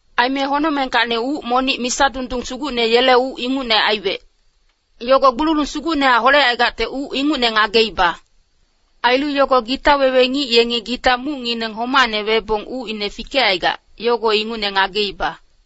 Aime honocmengkacni uc monic misa dundung sugucne yele uc ingucne aiwec. Yogo gbululung sugucnehac holecaigacte uc ingucne ngageiba. Ailu yogo gita wewe ngic yengi gita mucngineng homacne webong ucine fikecaigac, yogo ingucne ngageiba.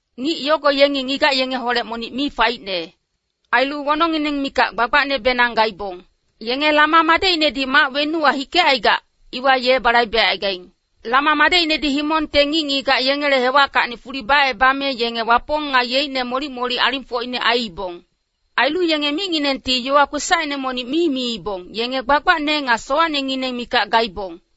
Ngic yogo yenge ngigac yengeholec monic mi faicne. Ailu wonongngineng mikac gbagbacnebenang gaibong. Yenge Lama madecinedi mac wenuwa hikecaigac, iwa ye balaibecaigaing. Lama madecinedi himongte ngic-ngigac yengele hewackacni fuli bacebame yenge Wapong nga yeicne molic-molic alingfocine aiibong. Ailu yenge micnginengti yowa kwesacine monic mi miibong, yenge gbagbacne nga sowacnengineng mikac gaibong.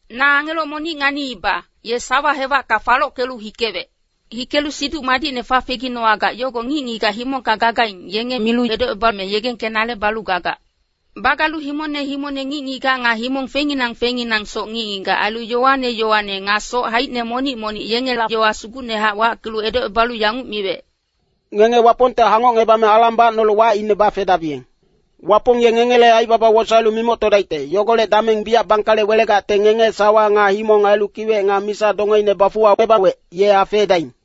Na angelo monic nganiiba, ye sawa hewacka falockelu hikewec. Hikelu Siduc Madicne fafeginowagac, yogo ngic-ngigac himongka gagaing, yenge milu edocebame yegengkenale balu gagac. Bagalu himongne himongne ngic-ngigac, nga himong fengnginang fengnginangsoc ngic-ngigac, ailu yowane yowane, nga soc haicine monic-monic, yengela yowa sugucnehac wackelu edocebalu yanguc miwec, “Ngenge Wapongte hangocngebame alang bacnolu wacine bafedabiyeng. Wapong ye ngengele aibaba wosaelu mimoctodaicte, yogolec dameng biyac bangkale welegacte ngenge sawa nga himong ailu kiwec nga misa dongeine bafuwacebawec, ye afeedaing.”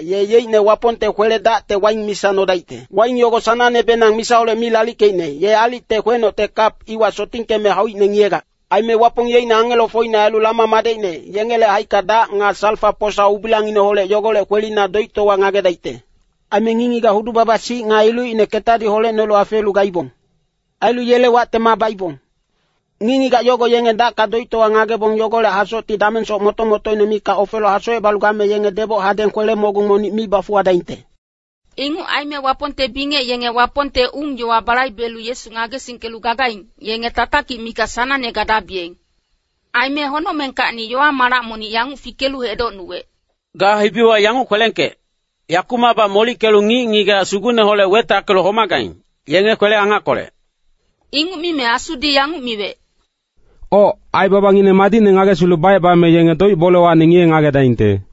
ye yeicne Wapongte kwele-dacte waing misa nodaicte. Waing yogo sanangnebenang misaholec mi lalickeicne, ye aalicte kwenocte kap iwa sotingkeme hauicne ngiyegac. Aime Wapong yeicne angelofocine ailu Lama madecine, yengele haicka dac nga salfa-posa ubilangineholec yogolec kwelina doictowa ngagedaicte. Aime ngic-ngigac hudu-baba-sic nga ilucine ketadi holecnolu afeelu gaibong. Ailu yele wacte maa baibong. Ngic-ngigac yogo yenge dacka doictowa ngagebong yogolec hasocti damengsoc moto-motoine mikac ofelu hasocebalu game yenge deboc hadeng kwele-mogung monic mi bafuwadaingte.” Inguc aime Wapongte bingec yenge Wapongte ung-yowa balaibelu Yesu ngagesingkelu gagaing, yenge tatakic mikac sanangne gadabiyeng. Aime honocmengkacni yowa-malac monic yanguc fikelu edocnuwec, “Ga hibiwa yanguc kwelengkec, ‘Yakumacbac molickelu ngic-ngigac Sugucneholec wetackelu homagaing, yenge kwele-angackolec.’” Inguc mime Asudi yanguc miwec, “Oc, aibabangineng madicne ngagesilu bacebame yenge doic-bolewacni ngiye-ngagedaingte.”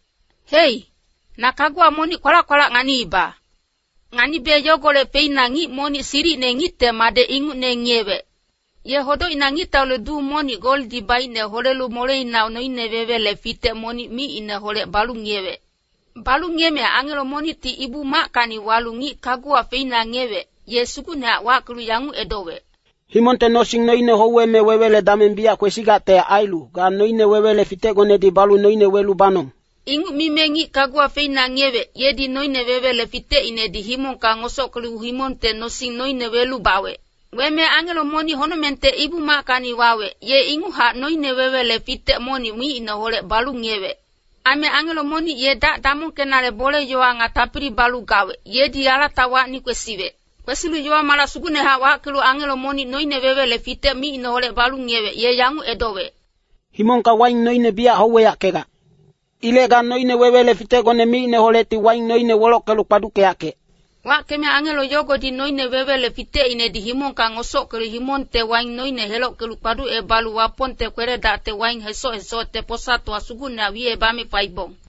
Hei, na kaguwa monic kwalac-kwalac nganiiba. Nganibe yogolec feina ngic monic silicine ngicte madec ingucne ngiyewec. Ye hodocina ngictaule duu monic goldi baicne holelu moleina noine-wewele fitec monic micineholec balu ngiyewec. Balu ngiyeme angelo monicti Ibu-mackacni walu ngic kaguwa feina ngiyewec, ye sugucnehac wackelu yanguc edowec, “Himongte nosing noine houweme wewele dameng biyac kwesigacte ailu, ga noine-wewele fitecgonedi balu noine welu banong.” Inguc mime ngic kaguwa feina ngiyewec, yedi noine-wewele fitecinedi himongka ngosockelu himongte nosing noine welu bawec. Weme angelo monic honocmengte Ibu-mackacni wawec, ye inguchac noine-wewele fitec monic micineholec balu ngiyewec. Aime angelo monic ye dac damongkenale bole-yowa nga tapili balu gawec, yedi alatawacni kwesiwec. Kwesilu yowa-malac sugucnehac wackelu angelo monic noine-wewele fitec micineholec balu ngiyewec, ye yanguc edowec, “Himongka waing noine biyac houweyackegac. Ilec ga noine-wewele fitecgone micineholecti waing noine welockelu kpaduckeyackec.” Wackeme angelo yogodi noine-wewele fitecinedi himongka ngosockelu himongte waing noine helockelu kpaducebalu Wapongte kwele-dacte waing hesoc-hesocte posatowa sugucna wicebame faibong.